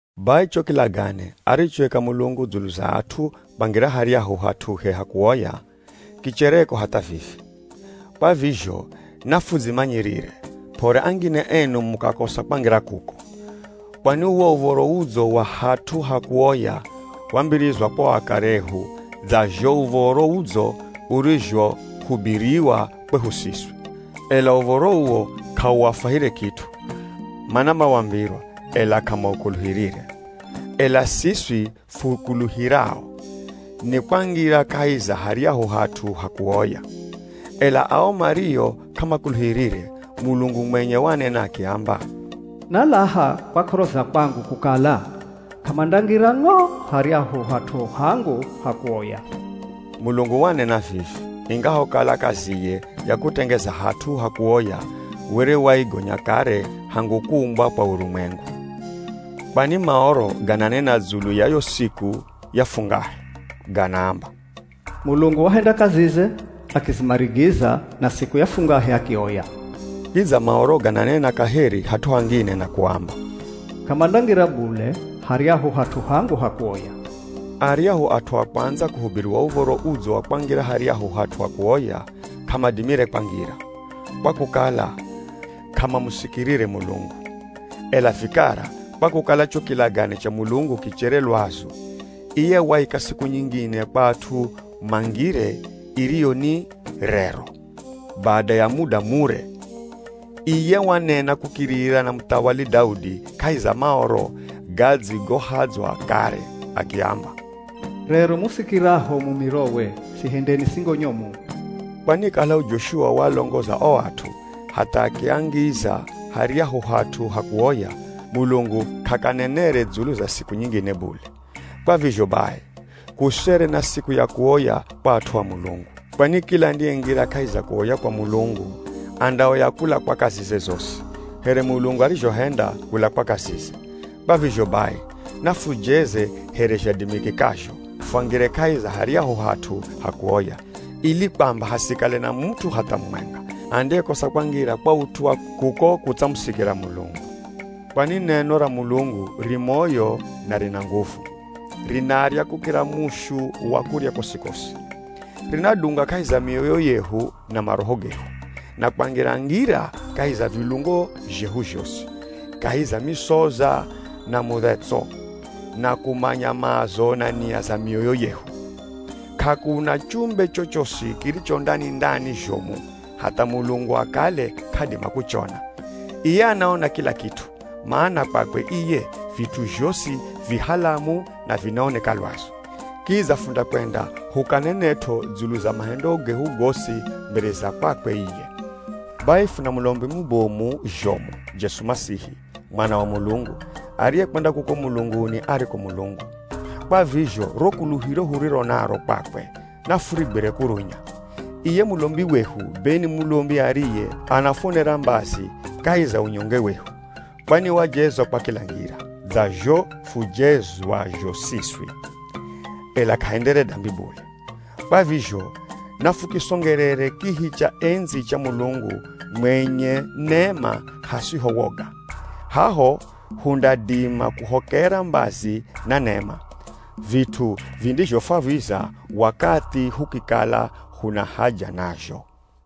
Bai cho kilagane arichoika Mulungu dzulu za at'u kwangira haryahu hat'uhe ha kuoya, kichereko hatha vivi. Kwa vizho nafudzimanyirire, p'ore angine enu mukakosa kwangira kuko. Kwani uwo uv̱oro udzo wa hat'u ha kuoya wambirizwa kwa o akare ehu dza zho Uv̱oro Udzo urizhohubiriwa kwehu siswi. Ela uv̱oro uwo k'auafwahire kit'u, mana mawambirwa ela k'amaukuluhirire. Ela siswi fukuluhirao, nikwangira kahi za haryahu hat'u ha kuoya. Ela ao mario k'amakuluhirire, Mulungu mwenye wanena akiamba, “Nalaha kwa k'oro za kwangu, kukala, ‘K'amandangira ng'o haryahu hat'u hangu ha kuoya.’” Mulungu wanena vivi, ingahokala kaziye ya kutengeza hat'u ha kuoya were waigonya kare hangu kuumbwa kwa urumwengu. Kwani Maoro, gananena dzulu ya yo siku ya fungahe. Ganaamba, “Mulungu wahenda kazize akizimarigiza, na siku ya fungahe akioya.” Kidza Maoro gananena kaheri hat'u hangine na kuamba, “K'amandangira bule haryahu hat'u hangu ha kuoya.” Aryahu at'u a kwandza kuhubiriwa Uv̱oro Udzo wa kwangira haryahu hat'u ha kuoya, k'amadimire kwangira, kwa kukala k'amamusikirire Mulungu. Ela vikara, kwa kukala cho kilagane cha Mulungu kichere lwazu, iye waika siku nyingine kwa at'u mangire, iriyo ni “Rero.” Bada ya muda mure, iye wanena kukirira na muthawali Daudi kahi za Maoro gadzigohadzwa kare, akiamba, “Rero musikiraho mumirowe, sihendeni singo nyomu.” Kwani kalaho Joshua waalongoza o at'u hatha akiangiza haryahu hat'u ha kuoya, Mulungu k'akanenere dzulu za siku nyingine bule. Kwa vizho bai, kusere na siku ya kuoya kwa at'u a Mulungu. Kwani kila andiyengira kahi za kuoya kwa Mulungu, andaoya kula kwa kazize zosi, here Mulungu arizhohenda kula kwa kazize. Kwa vizho bai, nafujeze here zhadimikikazho, fwangire kahi za haryahu hat'u ha kuoya, ili kwamba hasikale na mut'u hatha mumwenga, andiyekosa kwangira kwa ut'u wa kuko kutsamusikira Mulungu. Kwani neno ra Mulungu ri moyo na rina nguvu, rinarya kukira mushu wa kurya kosi-kosi. Rinadunga kahi za mioyo yehu na maroho gehu, na kwangira-ngira kahi za vilungo zhehu zhosi, kahi za misoza na mudhetso, na kumanya maazo na nia za mioyo yehu. K'akuna chumbe chochosi kiricho ndani-ndani zhomu, hatha Mulungu akale k'adima kuchona. Iye anaona kila kit'u, mana kwakwe iye vit'u zhosi vi halamu na vinaoneka lwazu. Kidza fundakwenda hukanenet'o dzulu za mahendo gehu gosi mbere za kwakwe iye. Bai, funa mulombi mubomu zhomu, Jesu Masihi, Mwana wa Mulungu, ariyekwenda kuko mulunguni ariko Mulungu. Kwa vizho ro kuluhiro huriro naro kwakwe nafurigwire kurunya. Iye mulombi wehu, be ni mulombi ariye anafuonera mbazi kahi za unyonge wehu. Kwani wajezwa kwa kila ngira, dza zho fujezwazho siswi, ela k'ahendere dambi bule. Kwa vizho nafukisongerere kihi cha endzi cha Mulungu mwenye nema hasiho woga. Haho hundadima kuhokera mbazi na nema, vit'u vindizhofwaviza wakathi hukikala huna haja nazho.